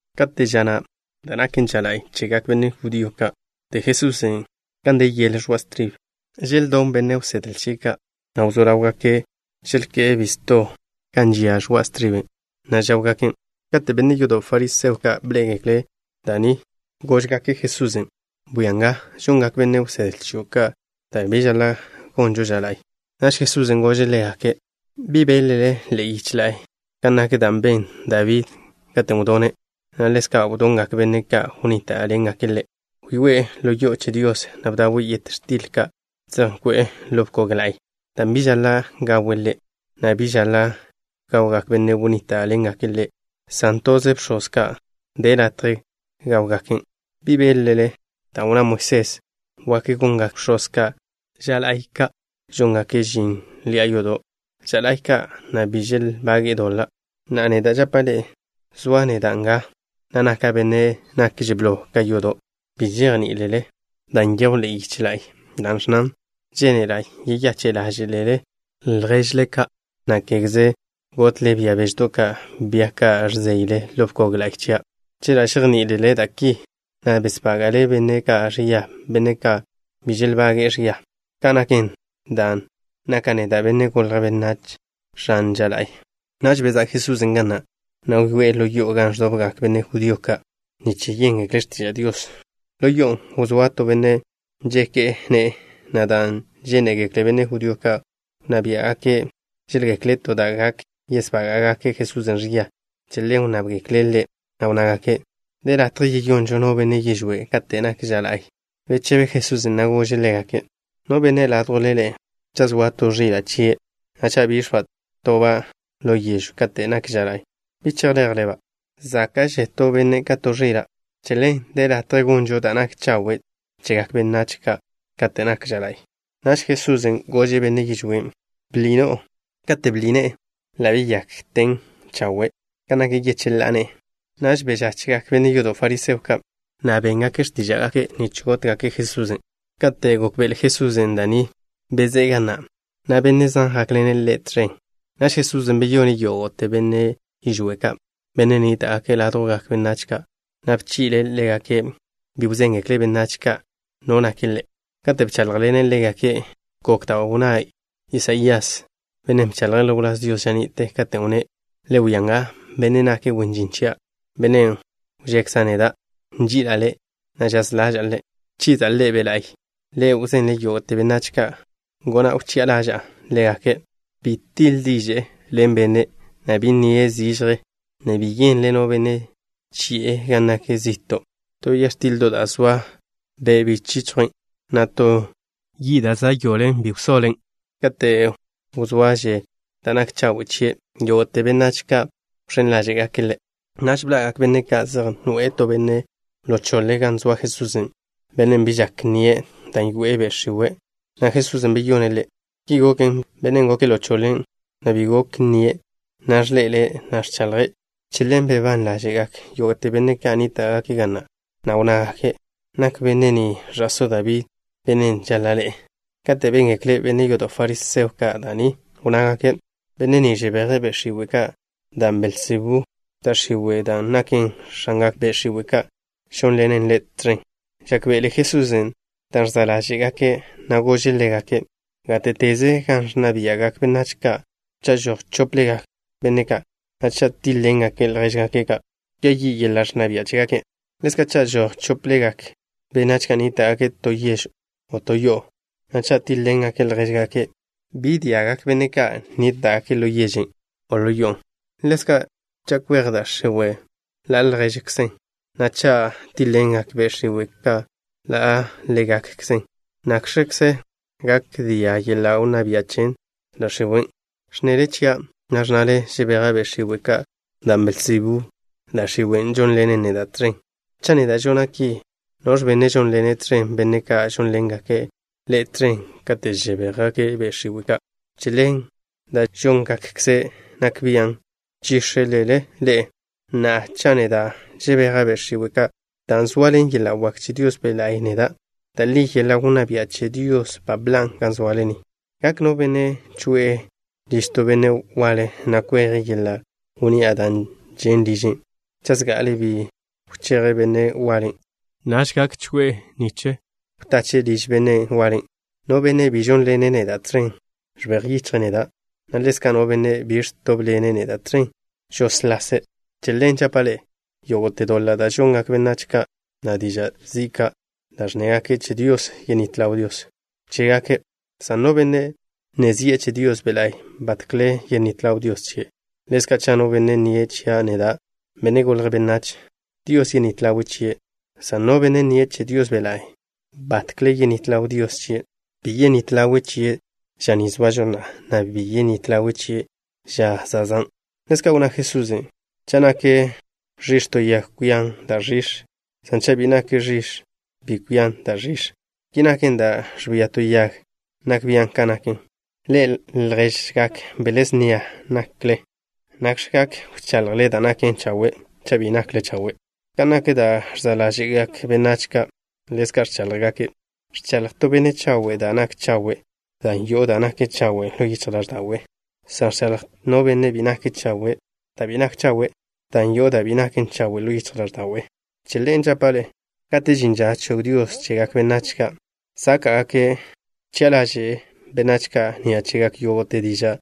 Kate' ža na', da' naken ža la'y chegak benne' judío ka', wdé Jesusen' gan de yele ẕoa' stribe. Želdón benne' wsedle chie' ka', na' wzó ḻáwgake' želké'e bisto gan žia ẕoa' striben', na' žáwgaken'. Kate' benne' yodo' fariseo ka' bḻé'egekle' da' ni, góžgake' Jesusen': —Bwia nga, žongak benne' wsedle chio' ka' da' bi žaḻa' gonžo ža la'y. Naž Jesusen' gože' ḻégake': —¿Bi beḻ-le ḻe'e yiche la'y kan nak da' ben Dabí katen' wdone', na' ḻezka' wdongak benne' ka' wnníta'ḻengake' ḻe'? Wyoé'e ḻo yo'o che Dios, na' bdawe' yet x̱til ka' zej nkwe'e ḻo bkog la'y, dan' bi žaḻa' gawe' ḻe', na' bi žaḻa' gawgak benne' ka' wnníta'ḻengake' ḻe', san toze bx̱oz ka' de latje gáwgaken'. ¿Bi beḻ-le da' wnná Moisés wak gongak bx̱oz ka' ža la'y ka'? Žóngake' žin ḻi'a yodo' ža la'y ka', na' bi želbage'e doḻa'. Na'a, neda' žapa' ḻe'e, zoa' neda' nga, na' naka' benne' nakže' blo ka yodo'. Bi žejní'ilele dan' nyejw ḻe'e yiche la'y, da' ẕnnan: “Žénela' yeyache' ḻáže'lele lježle ka', na' kégeze gotle bia beždo' ka', bia ka' ẕzeyle ḻo bkog la'y chia'.” Chela' žejní'ilele da' ki, bi besbága'le benne' ka' ẕia, benne' ka' bi želbage'e ẕia. Ka' naken, dan' naka' neda', Benne' Golje' Benách, X̱an ža la'y. Naž bezá' Jesusen' ga na', na' wyoé'e ḻo yo'o gan ẕdobgak benne' judío ka' nich yéngekle' x̱tiža' Dios. Ḻo yo'on' wzóa to benne' nžeke' ne'e, na' dan' žénegekle benne' judío wnná bia' ka' žéḻgekle' to da' gak yesbága'gake' Jesusen' ẕia, che ḻen wnnábgekle' Ḻe', na' wnnágake': —¿De latje yeyonžo no benne' yižwé' kate' nak ža la'y? Bechebe Jesusen', na' gože' ḻégake': —No benne' ládjwle ḻe'e, cha' zoa to ẕila' chie', na' cha' bix̱ba' toba' ḻo yežw kate' nak ža la'y, ¿bi chejleje'-ba'? Záka'že to benne' ka to ẕila'. Che ḻen, de latje gonžo da' nak chawe' chegak benách ka' kate' nak ža la'y. Naž Jesusen' gože' benne' yižwén': —Bḻi no'o. Kate' bḻi ne'e, ḻa' beyakten chawe' kan nak yecheḻá'a ne'e. Naž bežachjgak benne' yodo' fariseo ka', na' béngake' x̱tíža'gake' nich gótgake' Jesusen'. Kate' gókbe'ele Jesusen' da' ni, bezé'e ga na', na' benne' zan jákḻene' Ḻe' tẕen. Naž Jesusen' beyone' yógo'te benne' yižwé' ka', benne' nníta'gake' ládjwgak benách ka', na' bchi'le' ḻégake' bi wzéngekle' benách ka' no nake' Ḻe'. Kate' bcháḻjḻene' ḻégake' gok da' wnná Isaías, bennen' bchaḻje' ḻo wláz Dios ža ni'te, katen' wnné': Le wia nga, Bennen' nake' wen žin chia', Bennen' wžekza' neda'. Nži'ila' Ḻe', na' žaz ḻaža'a Ḻe'. Wchiza' Ḻe' Be' La'y. Ḻe' wzenle' yógo'te benách kan gona', wchi'a ḻaža'a ḻégake'. Bi tiḻ diže'e ḻen no benne', na' bi nnie' zižje, na' bi yenle no benne' chi'e gan nak zi'to'. To ya x̱tildo' da' zoa be bi chichjwen', na' to yi' da' za' yoḻen, bi wsoḻen', kate' wzoaže' da' nak chawe' chie'. Yógo'te benách ka' wẕén ḻáže'gake' Ḻe'. Naž bḻa'gak benne' ka' zej noe'e to benne' ḻo choḻe gan zoa Jesusen', bennen' bi žak nnie', dan' yoe'e be' x̱iwe', na' Jesusen' beyone' ḻe'. Ki goken, bennen' goke' ḻo choḻe, na' bi gok nnie', na'a ẕḻe'ele', na' ẕchaḻje'. Che ḻen bebán ḻáže'gak yógo'te benne' ka' nníta'gake' ga na', na' wnnágake': —¿Nak benne' ni ẕa'só Dabí, bennen' žaḻa' ḻe'e? Kate' béngekle benne' yodo' fariseo ka' da' ni, wnnágake': —Benne' ni žebeje' be' x̱iwe' ka', dan' Belzebú, da' x̱iwe', dan' naken x̱angak be' x̱iwe' ka', žónḻenen Ḻe' tẕen. Žákbe'ele Jesusen' dan' ẕza' ḻáže'gake', na' gože' ḻégake': —Gáte'teze gan ẕnna bia'gak benách ka', cha' žoj chóplegak benne' ka', na' cha' tíḻ-ḻengake' ljéžgake' ka', kwia yi' yeḻa' wnná bia' chégake'. Ḻezka', cha' žoj chóplegak benách ka' nníta'gake' to yež o to yo'o, na' cha' tíḻ-ḻengake' ljéžgake' ka', bi gak dia'gak benne' ka' nníta'gake' ḻo yežen' o ḻo yo'on'. Ḻezka', cha' kwej da' x̱iwe' ḻa' ljéžekzen, na' cha' tíḻ-ḻengak be' x̱iwe' ka' ḻa' ḻégakkzen, ¿nakx̱kze gak dia' yeḻa' wnná bia' che da' x̱iwen'? Ẕnnele chia', na' ẕnnale žebeja' be' x̱iwe' ka' dan' Belzebú da' x̱iwe' žónḻenen neda' tẕen. Cha' neda' žona' ki, ¿noẕ benne' žónḻene' tẕen benne' ka' žónḻengake' ḻe'e tẕen kate' žebéjgake' be' x̱iwe' ka'? Che ḻen, da' žóngakkze' nak bian' nchíx̱elele ḻe'e. Na'a, cha' neda' žebeja' be' x̱iwe' ka' dan' zoaḻen yeḻa' wak che Dios Be' La'y neda', da' li yeḻa' wnná bia' che Dios ba bḻan' ga zoale ni. ’¿Gak no benne' choe'e liž to benne' waḻe, na' kweje' yeḻa' wnni'a da' žen' liže', cha' zga'ale bi wcheje' benne' waḻen'? Naž gak choe'e nich wtache' liž benne' waḻen'. ’No benne' bi žónḻene' neda' tẕen, ẕbej yichje' neda', na' ḻezka' no benne' bi ẕtóbḻene' neda' tẕen, žóslase'. ’Che ḻen žapa' ḻe'e, yógo'te doḻa' da' žongak benách ka', na' diža' zi' ka' da' ẕnnégake' che Dios, yenít ḻaw Dios chégake', san no benne' nne zi'e che Dios Be' La'y, batkle yenít ḻaw Dios chie'. Ḻezka', cha' no benne' nnie' chia' neda', Benne' Golje' Benách, Dios yenít ḻawe' chie', san no benne' nnie' che Dios Be' La'y, batkle yenít ḻaw Dios chie'. Bi yenít ḻawe' chie' ža ni zoažo na'a, na' bi yenít ḻawe' chie' ža zezán'. Ḻezka' wnná Jesusen': —Cha' nak ẕix̱ to yag, kwian da' ẕix̱, san cha' bi nak ẕix̱ bi kwian da' ẕix̱. Ki naken, da' ẕbia to yag nak bian' kan naken. Ḻe'e, lježgak bele snia nakle. ¿Nakx̱ gak wchaḻjle da' naken chawe', cha' bi nakle chawe'? Kan nak da' ẕza' ḻáže'gak benách ka', ḻezka' ẕcháḻjgake'. Ẕchaḻj to benne' chawe' da' nak chawe' dan' yo'o da' naken chawe' ḻo yichj ḻáẕda'we', san ẕchaḻj no benne' bi nake' chawe' da' bi nak chawe', dan' yo'o da' bi naken chawe' ḻo yichj ḻáẕda'we'. Che ḻen žapa' ḻe'e, kate' žin ža chog Dios chegak benách ka' sáka'gake', wchi'a ḻaže'e benách ka' ni'a chegak yógo'te diža'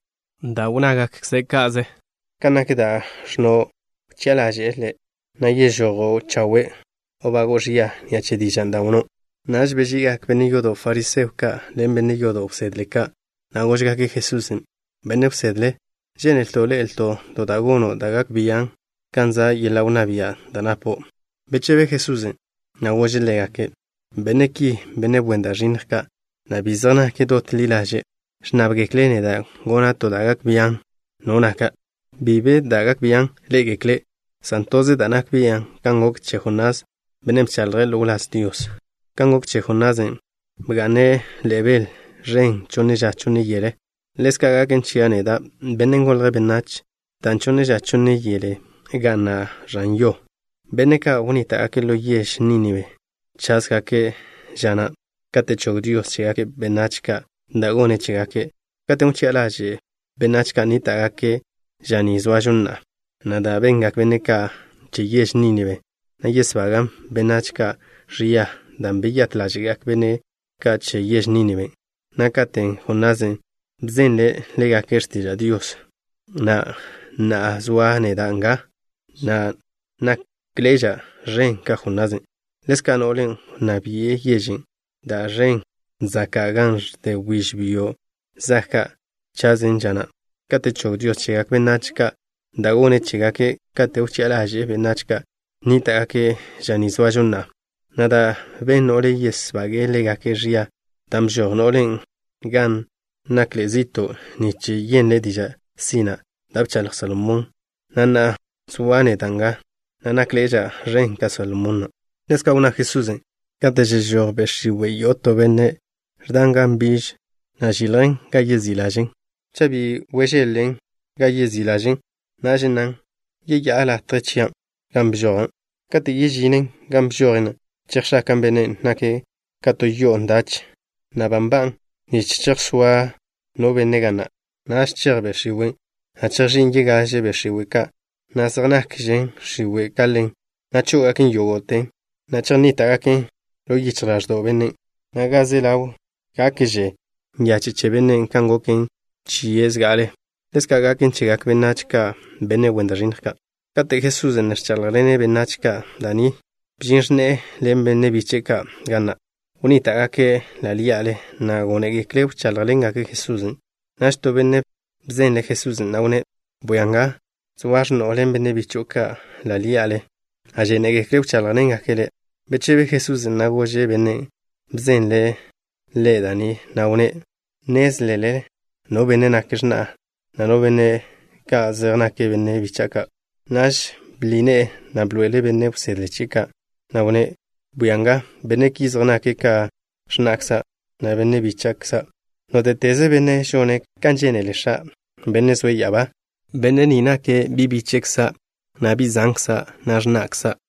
da' wnnágakkze' ka'ze. Kan nak da' ẕnno', wchi'a ḻaže'e le', na' yežojo' chawe' o bago'o ẕia ni'a che dižan' da' wnnó'. Naž beži'igak benne' yodo' fariseo ka' ḻen benne' yodo' wsedle ka', na' góžgake' Jesusen': —Benne' wsedle, žénelto' ḻe'elto' to da' gono' da' gak bian' gan za' yeḻa' wnná bian' da' napo'. Bechebe Jesusen', na' gože' ḻégake': —Benne' ki, benne' wen da' ẕinnj ka', na' bi zej nake' dot ḻi ḻaže', ẕnnábgekle' neda' gona' to da' gak bian' no naka'. Bi be da' gak bian' ḻé'egekle', san toze da' nak bia' kan gok che Jonás, bennen' bchaḻje' ḻo wláz Dios. Kan gok che Jonasen', bga'ne' ḻe'e bel ẕen chonne ža chonne yele, ḻezka' gaken chia' neda', Benne' Golje' Benách, dan' chonne ža chonne yele ga'na' ẕan yo. Benne' ka' wnníta'gake' ḻo yež Nínibe chásgake' ža na' kate' chog Dios chegak benách ka' da' gone' chégake', katen' wchi'a ḻaže'e benách ka' nníta'gake' ža ni zoažo na'a, na' da' bengak benne' ka' che yež Nínibe na' yesbagan' benách ki ẕia dan' beyát ḻáže'gak benne' ka' che yež Nínibe na' katen' Jonasen' bzenle' ḻégake' x̱tiža' Dios, na' na'a zoa' neda' nga, na' nákḻe'eža' ẕen ka Jonasen'. Ḻezka' no'len' wnná bi'e yežen' da' žen' zaka' gan ẕde wbíž byo' zag ka' chase' ža na' kate' chog Dios chegak benách ka' da' gone' chégake' kate' wchi'a ḻaže'e benách ka' nníta'gake' ža ni zoažo na'a, na' da' ben no'len' yesbagan' ḻégake' ẕia, dan' bžoj no'len' gan nakḻe'e zi'to' nich yenle' diža' sina' da' bchaḻj Salomón, na' na'a zoa' neda' nga, na' nákḻe'eža' ẕen ka Salomón na'. Ḻezka' wnná Jesusen': —Kate' žežój be' x̱iwe' yo'o to benne', ẕdan gan nbiž, na' žiljen gan yezí' ḻažen'. Cha' bi wžeḻ-len gan yezí' ḻažen', naž nnan: “Yeyá'a latje chia' gan bžoja'.” Kate' yežinen gan bžojen, chejx̱akan' bennen', nake' ka to yo'o ndachen, na' nloan, na' ba nba'an nich chejsóa no benne' ga na'. Naž chej be' x̱iwen', na' chejx̱ín' yegaže be' x̱iwe' ka', be' zej nakžen x̱iwe' ka ḻen, na' chó'ogaken yógo'ten, na' chejnníta'gaken ḻo yichj ḻáẕdo'w bennen', na' ga ze ḻaw gakže nyache' che bennen' kan goken chie' zga'ale. Ḻezka' gaken chegak benách ki, benne' wen da' ẕinnj ka'. Kate' Jesusen' ne ẕcháḻjḻene' benách ka' da' ni, bžin x̱ne'e ḻen benne' biche'e ka' ga na'. Wnníta'gake' ḻa' ḻí'ale, na' gónegekle' wcháḻjḻengake' Jesusen'. Naž to benne' bzenlen' Jesusen', na' wnné': —Bwia nga, zoa x̱no'o ḻen benne' bicho'o ka' ḻa' ḻí'ale, na' žénegekle' wcháḻjḻengake' Le'. Bechebe Jesusen', na' gože' bennen' bzenle' Ḻe' da' ni, na' wnné': —¿Nnézlele no benne' nake' x̱na'a, na' no benne' ka' zej nake' benne' bícha'ado' ka'? Naž bḻi ne'e, na' bḻoe'ele' benne' wsedle chie' ka', na' wnné': —Bwia nga, benne' ki zej nake' ka x̱na'kza', na' benne' bíche'kza' ka'. Nóte'teze benne' žone' kan žénele X̱a', Bennen' zoe' ya'abá, benne' ni nake' bi' bíche'kza', na' bi' zankza', na' x̱na'kza'.